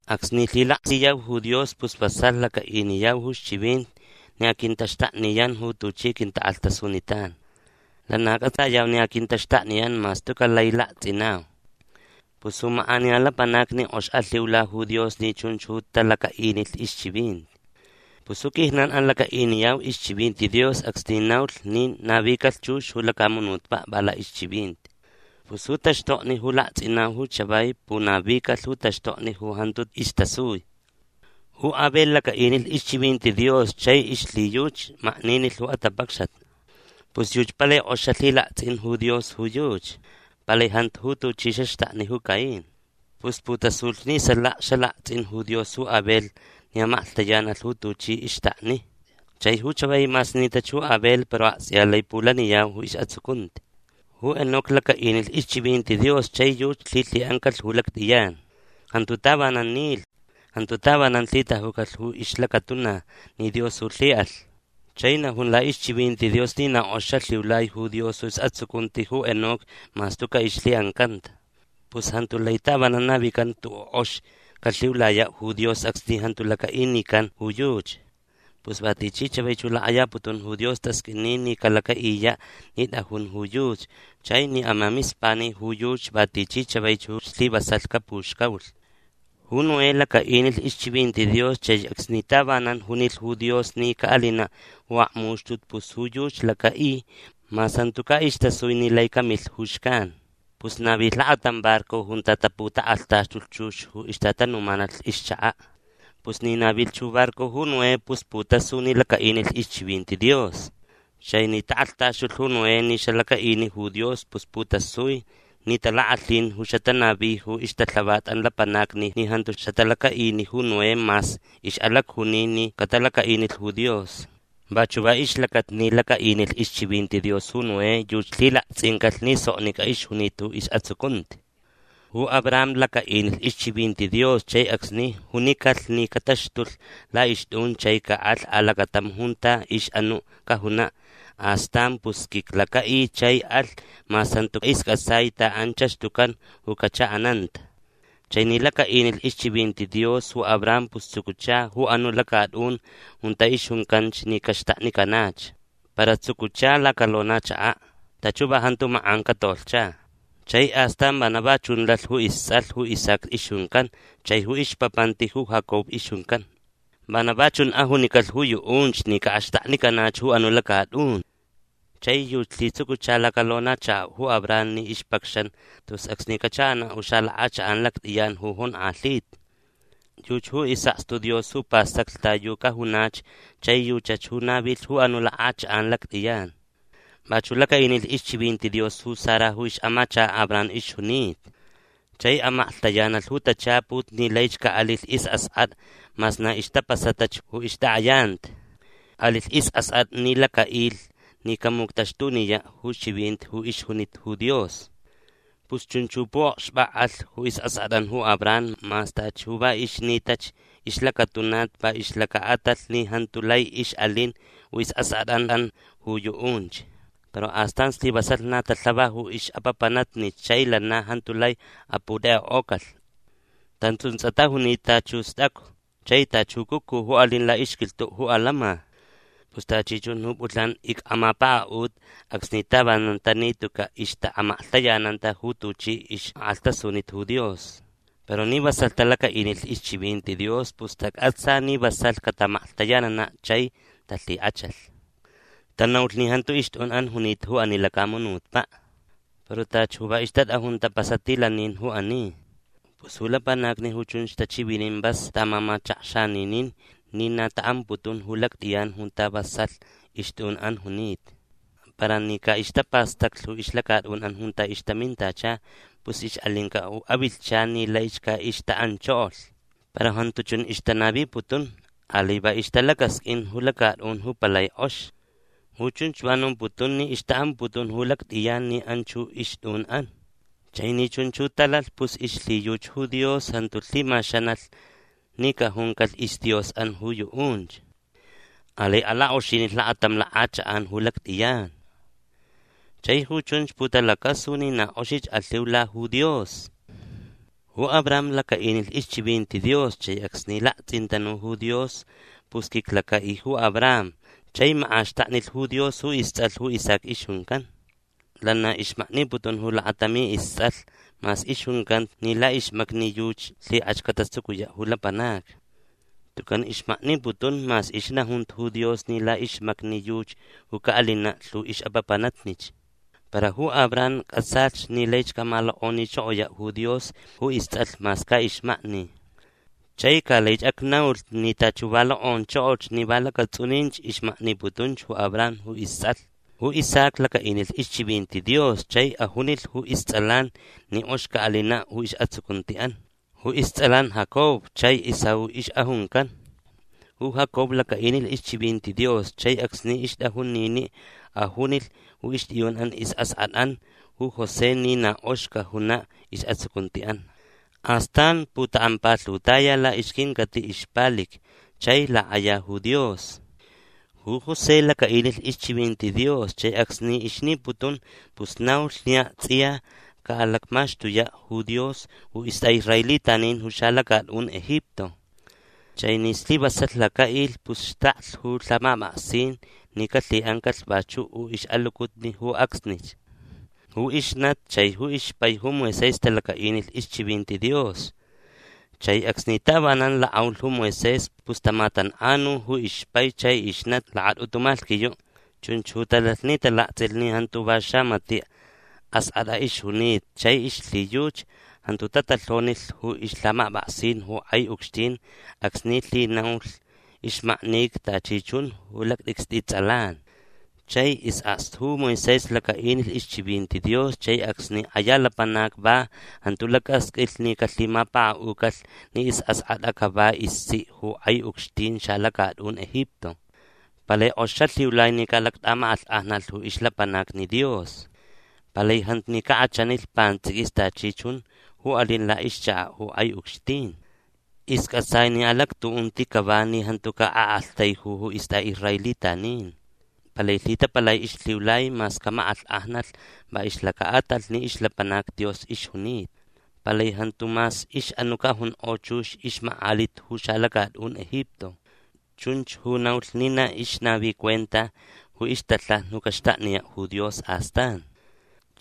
Acsni lhilaksiyau ju Dios pus vasalh lacaʼiniyau ju ixchivinti ni aquintaxtakniyan ju tuchi quintakʼalhtasunitan. Lana cʼatsayau ni aquintaxtakniyan mas tucaʼ lai laktsʼinau. Pus ju makʼaniya lapanacni kʼox alhiula ju Dios ni chunch ju talacaʼinilh ixchivinti. Pus ju quijnanʼan lacaʼiniyau ixchivinti Dios acsni naulh ni navicalh chux ju lacamunutpaʼ va laʼixchivinti. Pus ju taxtokni ju laktsʼinau ju chavai punavicalh ju taxtokni ju jantu istasui. Ju Abel lacaʼinilh ixchivinti Dios chai ixlhiyuchi makninilh ju atapacxat. Pus yuchi palai kʼox xalhilaktsʼin ju Dios ju yuchi. Palai jantu ju tuchi xaxtakni ju Caín. Pus putasulh ni salaka xalaktsʼin ju Dios ju Abel ni amaklhtayanalh ju tuchi ixtakni. Chai ju chavai mas nitach ju Abel para aktsʼiya lai pulaniyau ju isʼatsucunti. Ju Enoc lacaʼinilh ixchivinti Dios chai yuchi lhilhiʼancalh ju lactʼiyan. Jantu tavanan nilh. Jantu tavanan lhitajucalh ju ixlacatuna ni Dios ju lhiʼalh. Chai najun laʼixchivinti Dios ni na kʼox xalhiulai ju Dios isʼatsucunti ju Enoc mas tucaʼ ixlhiʼancanta. Pus jantu lai tavanan navican ju tuʼuʼ ju kʼox calhiulayaʼ ju Dios acsni jantu lacaʼinican ju yuchi. Pus va tichi chavaich ju lakʼayaputun ju Dios tasqʼuini ni calacaʼiyaʼ ni tʼajun ju yuchi chai ni amamispani ju yuchi va tichi chavaich ju slivasalh capuxcaulh. Ju Noé lacaʼinilh ixchivinti Dios chai acsni tavanan junilh ju Dios ni caʼalinaʼ ju akmuxtut pus ju yuchi lacaʼi mas jantucaʼ istasui ni lai camilh ju xcan. Pus navilh lakatam barco junta taputakʼalhtaxtulh chux ju ixtatanumanalh ixchakaʼ. Pus ni navilh ju barco ju Noé pus putasu ni lacaʼinilh ixchivinti Dios. Chai ni takʼalhtaxtulh ju Noé ni xalacaʼini ju Dios pus putasui ni talakʼalhin ju xatanavi ju ixtalhavatʼan lapanacni ni jantu xatalacaʼini ju Noé mas ixʼalacjuni ni catalacaʼinilh ju Dios. Vachuʼ va ixlacata ni lacaʼinilh ixchivinti Dios ju Noé yuchi lhilaktsʼincalh ni soknicʼa ixjunita ju isʼatsucunti. Ju Abraham lacaʼinilh ixchivinti Dios chai acsni junicalh ni cataxtulh laʼixtʼun chai caʼalh alacatam junta ixʼanuʼ cajunaʼ astan pus quiclacaʼi chai alh mas jantu iscʼatsai ta anchach tucan ju cachaʼananta. Chai ni lacaʼinilh ixchivinti Dios ju Abraham pus tsucucha ju anuʼ lacatʼun junta ixjuncanch ni caxtaknicanach. Para tsucucha lacalonachakaʼ. Tachi ju va jantu makʼan catolhcha. Chai astan vana va chun lalh ju istsʼalh ju Isaac ixjuncan chai ju ixpapanti ju Jacob ixjuncan. Vana va chun ajunicalh ju yuʼunch ni caʼaxtaknicanach ju anuʼ lacatʼun. Chai yuchi lhitsucucha lacalonachakaʼ ju Abraham ni ixpacxan tus acsni cachaʼanaʼ ju xalakʼachakʼan lactʼiyan ju jonkʼalhita. Yuchi ju isʼakstu Dios ju pastaclh ta yu cajunach chai yuchach ju navilh ju anuʼ lakʼachakʼan lactʼiyan. Vachuʼ lacaʼinilh ixchivinti Dios ju Sara ju ixʼamachakaʼ Abraham ixjunita. Chai amaklhtayanalh ju tachaput ni laich caʼalilh isʼaskʼatʼa mas na ixtapasatach ju ixtakʼayanti. Alilh isʼaskʼatʼa ni lacaʼilh ni camuctaxtuniyaʼ ju chivinti ju ixjunita ju Dios. Pus chunch ju puʼokxpakʼalh ju isʼaskʼatʼan ju Abraham mas tachi ju va ixnitach ixlacatuna va ixlacaʼatalh ni jantu lai ixʼalin ju isʼaskʼatʼanʼan ju yuʼunch. Para astan slivasalh na talhava ju ixʼapapanatnich chai lana jantu lai aputekʼekʼocalh. Tantsʼuntsʼa tajunita tachi ju stʼacu chai tachi ju cucu ju alin laʼixquilhtuʼ ju alama. Pus tachi chun ju pʼulhnan icʼamapakaʼuta acsni tavanan tani tucaʼ ixtaʼamaklhtayananta ju tuchi ixʼakʼalhtasunita ju Dios. Para ni vasalh talacaʼinilh ixchivinti Dios pus tacʼatsa ni vasalh cataʼamaklhtayananaʼ chai talhikʼachalh. Tanaulh ni jantu ixtʼunʼan junita ju ani lacamunutpaʼ. Para tachi ju va ixtatʼajun tapasatilanin ju ani. Pus ju lapanacni ju chunch tachivinin vas taʼamamachakxaninin ni na taʼamputun ju lactʼiyan junta vasalh ixtʼunʼan junita. Para ni caʼixtapastaclh ju ixlacatʼunʼan junta ixtamintacha pus ixʼalincaʼ ju avilhchan ni laich caʼixtaʼanchokolh. Para jantu chun ixtanaviputun. Alai va ixtalacasqʼuin ju lacatʼun ju palai kʼox. Ju chunch va nomputun ni ixtaʼamputun ju lactʼiyan ni anchach ju ixtʼunʼan. Chai ni chunch ju talalh pus ixlhiyuchi ju Dios jantu lhimaxanalh ni cajuncalh isDiosʼan ju yuʼunch. Alai alakʼoxinilh lakatam lakʼachakʼan ju lactʼiyan. Chai ju chunch putalacasu ni na kʼoxich alhiula ju Dios. Ju Abraham lacaʼinilh ixchivinti Dios chai acsni laktsʼintanu ju Dios pus quiclacaʼi ju Abraham chai makʼaxtaknilh ju Dios ju istsʼalh ju Isaac ixjuncan. Lana ixmakniputun ju lakatami istsʼalh mas ixjuncanta ni laʼixmacni yuchi lhikʼach catatsucuyaʼ ju lapanacni. Tucan ixmakniputun mas ixnajunta ju Dios ni laʼixmacni yuchi ju caʼalinaʼ lhu ixʼapapanatnich. Para ju Abraham cʼatsalh ni laich camalokʼonichokoyaʼ ju Dios ju istsʼalh mas caʼixmakni. Chai ca laich acnaulh ni tachi ju va lokʼonchokolh ni va lacatsʼuninch ixmakniputun ju Abraham ju istsʼalh. Ju Isaac lacaʼinilh ixchivinti Dios chai ajunilh ju istsʼalan ni kʼox caʼalinaʼ ju isʼatsucuntiʼan. Ju istsʼalan Jacob chai Esaú ixʼajuncan. Ju Jacob lacaʼinilh ixchivinti Dios chai acsni ixtʼajun niniʼ ajunilh ju ixtʼiyunʼan isʼaskʼatʼan ju José ni na kʼox cajunaʼ isʼatsucuntiʼan. Astan putakʼampalhutaya laʼixquincatiʼ ixpalic chai lakʼaya ju Dios. Ju José lacaʼinilh ixchivinti Dios chai acsni ixniputun pus naulh ni aktsʼiya caʼalacmaxtuyaʼ ju Dios ju istʼaʼisraelitanin ju xalacatʼun Egipto. Chai ni slivasalh lacaʼilh pus xtaklh ju lhamapʼaksin ni calhiʼancalh vachuʼ ju ixʼalucutni ju acsnich. Ju ixnati chai ixpai ju Moisés talacaʼinilh ixchivinti Dios chai acsni tavanan lakʼaulh ju Moisés pus tamatankʼanu ju ixpai chai ixnati lakatʼutu malhquiyuʼ. Chunch ju talalh ni talaktsʼilh ni jantu va xamatiʼ askʼatʼa ixjunita chai ixlhiyuchi jantu tatalhonilh ju ixlhamapʼaksin ju kʼai ucxtin acsni lhinaulh ixmaknica tachi chun ju lactʼicstʼi tsʼalan. Chai isʼakstu ju Moisés lacaʼinilh ixchivinti Dios chai acsni kʼaya lapanac va jantu lacasqʼuilh ni calhimapakaʼucalh ni isʼaskʼatʼa cava istsiʼ ju kʼai ucxtin xalacatʼun Egipto. Palai kʼox xalhiulai ni caʼalactʼamakʼalhkʼajnalh ju ixlapanacni Dios. Palai jantu ni cakʼachanilh pantsʼiquis tachi chun ju alin laʼixchakaʼ ju kʼai ucxtin. Iscʼatsai ni alactuʼunti cava ni jantu caʼaʼaktaiju ju istʼaʼisraelitanin. Palai lhitapalai ixlhiulai mas camakʼalhkʼajnalh va ixlacaʼatalh ni ixlapanac Dios ixjunita. Palai jantu mas ixʼanuʼ cajunkʼo chux ixmakʼaliʼ ju xalacatʼun Egipto. Chunch ju naulh ni na ixnavi cuenta ju ixtalhaja ju caxtakniyaʼ ju Dios astan.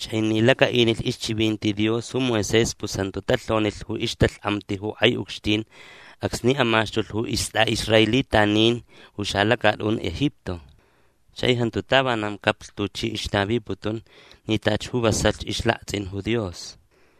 Chai ni lacaʼinilh ixchivinti Dios ju Moisés pus jantu talhonilh ju ixtalhkʼamti ju kʼai ucxtin acsni amaxtulh ju istʼaʼisraelitanin ju xalacatʼun Egipto. Chai jantu tavanan caplh tuchi ixnaviputun ni tachi ju vasalh ixlaktsʼin ju Dios.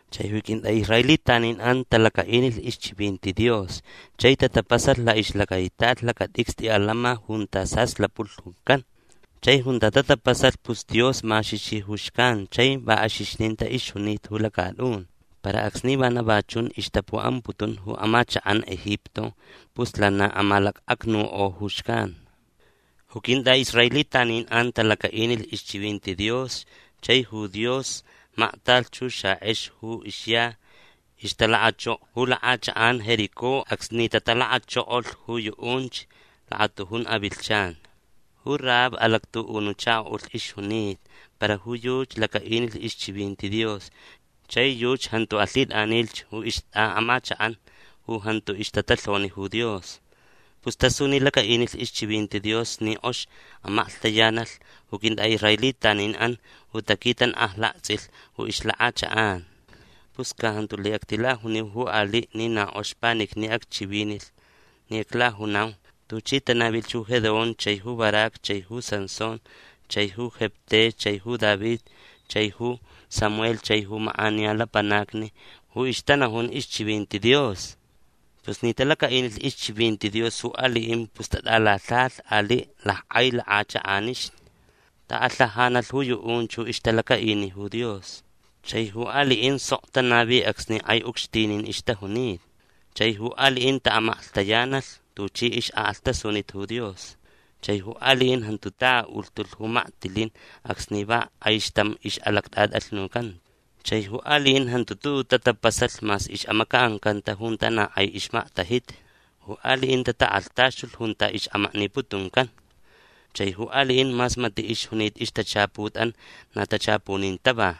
Chai ju quintʼaʼisraelitaninʼan talacaʼinilh ixchivinti Dios chai tatapasalh laʼixlacaitat lacatʼicstʼi alama junta saslapulh juncan. Chai junta tatapasalh pus Dios maxixi ju xcan chai va axixnita ixjunita ju lacatʼun. Para acsni vana va chun ixtapuʼamputun ju amachakʼan Egipto pus lana amalacʼacnukʼo ju xcan. Ju quintʼaʼisraelitaninʼan talacaʼinilh ixchivinti Dios chai ju Dios maktalh ju xakʼex ju ixya ixtalakʼachoko ju lakʼachakʼan Jericó acsni tatalakʼachokolh ju yuʼunch lakatujun avilhchan. Ju Rahab alactuʼunuʼ chakoʼulh ixjunita para ju yuchi lacaʼinilh ixchivinti Dios chai yuchi jantu alhitʼanilh ju ixtʼaʼamachakʼan ju jantu ixtatalhoni ju Dios. Pus tasu ni lacaʼinilh ixchivinti Dios ni kʼox amaklhtayanalh ju quintʼaʼisraelitaninʼan ju taquitankʼajlaktsʼilh ju ixlakʼachakʼan. Pus ca jantu lai actilajuniu ju aliʼ ni na kʼox panicni acchivinilh ni aclajunau tuchi tanavilh ju Gedeón chai ju Barac chai ju Sansón chai ju Jefté chai ju David chai ju Samuel chai ju makʼaniya lapanacni ju ixtanajun ixchivinti Dios. Pus ni talacaʼinilh ixchivinti Dios ju aliʼin pus tatʼalalhajalh aliʼ lackʼai lakʼachakʼanixni. Alhajanalh ju yuʼunch ju ixtalacaʼini ju Dios. Chai ju aliʼin sok tanavi acsni kʼai ucxtinin ixtajunita. Chai ju aliʼin taʼamaklhtayanalh tuchi ixʼakʼalhtasunita ju Dios. Chai ju aliʼin jantu ta aʼulhtulh ju maktilin acsni va kʼaixtam ixʼalactʼatʼalhnucanta. Chai ju aliʼin jantu tuʼuʼ tatapasalh mas ixʼamacaʼancanta junta na kʼai ixmaktajita. Ju aliʼin tatakʼalhtaxtulh junta ixʼamakniputuncan. Chai ju aliʼin mas matiʼ ixjunita ixtachaputʼan na tachapunin tava.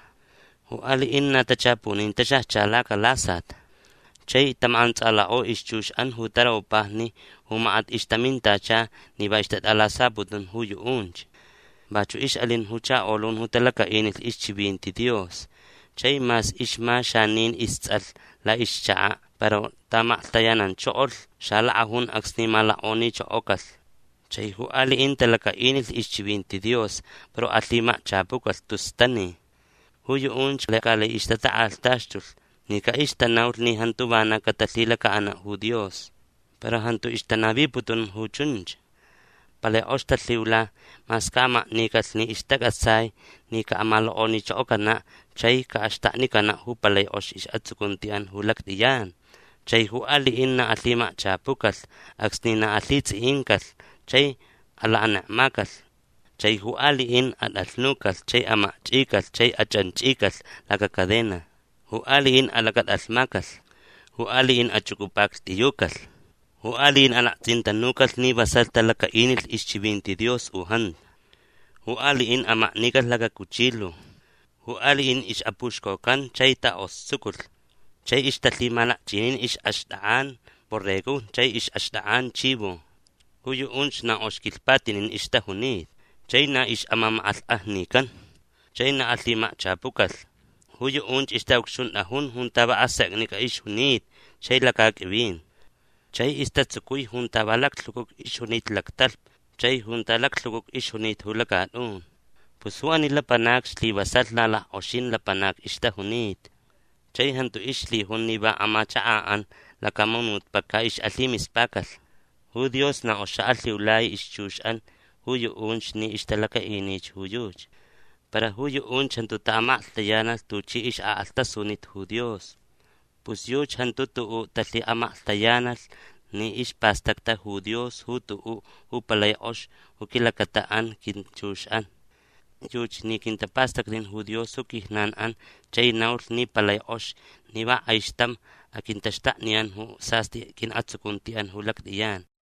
Ju aliʼin na tachapunin taxajcha lacalasat. Chai tamakʼantsʼalakʼo ixchuxʼan ju taropajni ju makat ixtamintacha ni va ixtatʼalasaputun ju yuʼunch. Vachuʼ ixʼalin ju chakolun ju talacaʼinilh ixchivinti Dios chai mas ixma xanin istsʼalh laʼixchakaʼ para taʼamaklhtayananchokolh xalakʼajun acsni malokʼonichokocalh. Chai ju aliʼin talacaʼinilh ixchivinti Dios para alhimakchapucalh tus tani. Ju yuʼunch lai caʼixtatakʼalhtaxtulh ni caʼixtanaulh ni jantu vana catalhilacaʼanaʼ ju Dios. Para jantu ixtanaviputun ju chunch. Palai kʼox talhiula mas caʼamaknicalh ni ixtacʼatsai ni caʼamalokʼonichokocanaʼ chai caʼaxtaknicanaʼ ju palai kʼox isʼatsucuntiʼan ju lactʼiyan. Chai ju aliʼin na alhimakchapucalh acsni na alhitsʼiʼincalh chai alakanekmacalh. Chai ju aliʼin atʼalhnucalh chai amakchʼicalh chai achʼanchʼicalh lacacadena. Ju aliʼin alacatʼalhmacalh. Ju aliʼin achʼucʼupaklhtʼiyucalh. Ju aliʼin alaktsʼintanucalh ni vasalh talacaʼinilh ixchivinti Dios u jantu. Ju aliʼin amaknicalh lacacuchilu. Ju aliʼin ixʼapuxcocan chai takʼostsuculh. Chai ixtalhimalakchʼinin ixʼaxtʼakʼan borregojni chai ixʼaxtʼakʼan chivo. Ju yuʼunch na kʼox quilhpatinin ixtajunita. Chai na ixʼamamakʼalhkʼajnican. Chai na alhimakchapucalh. Ju yuʼunch ixtaʼucxuntʼajun junta va aseknicʼa ixjunita chai lacaqʼuivin. Chai istatsucui junta va laclhucucu ixjunita lactalhpa chai junta laclhucucu ixjunita ju lacatʼun. Pus ju ani lapanacni slivasalh na lackʼoxin lapanacni ixtajunita. Chai jantu ixlhijun ni va amachakaʼan lacamunutpaʼ caʼixʼalhimispacalh. Ju Dios na kʼox xaʼalhiulai ixchuxʼan ju yuʼunch ni ixtalacaʼinich ju yuchi. Para ju yuʼunch jantu taʼamaklhtayanalh tuchi ixʼakʼalhtasunita ju Dios. Pus yuchi jantu tuʼuʼ talhiʼamaklhtayanalh ni ispastacta ju Dios ju tuʼuʼ ju palai kʼox ju quilacataʼan quinchuxʼan. Yuchi ni quintapastacnin ju Dios ju quijnanʼan chai naulh ni palai kʼox ni va kʼaixtam aquintaxtakniyan ju sastʼi quiʼatsucuntiʼan ju lactʼiyan.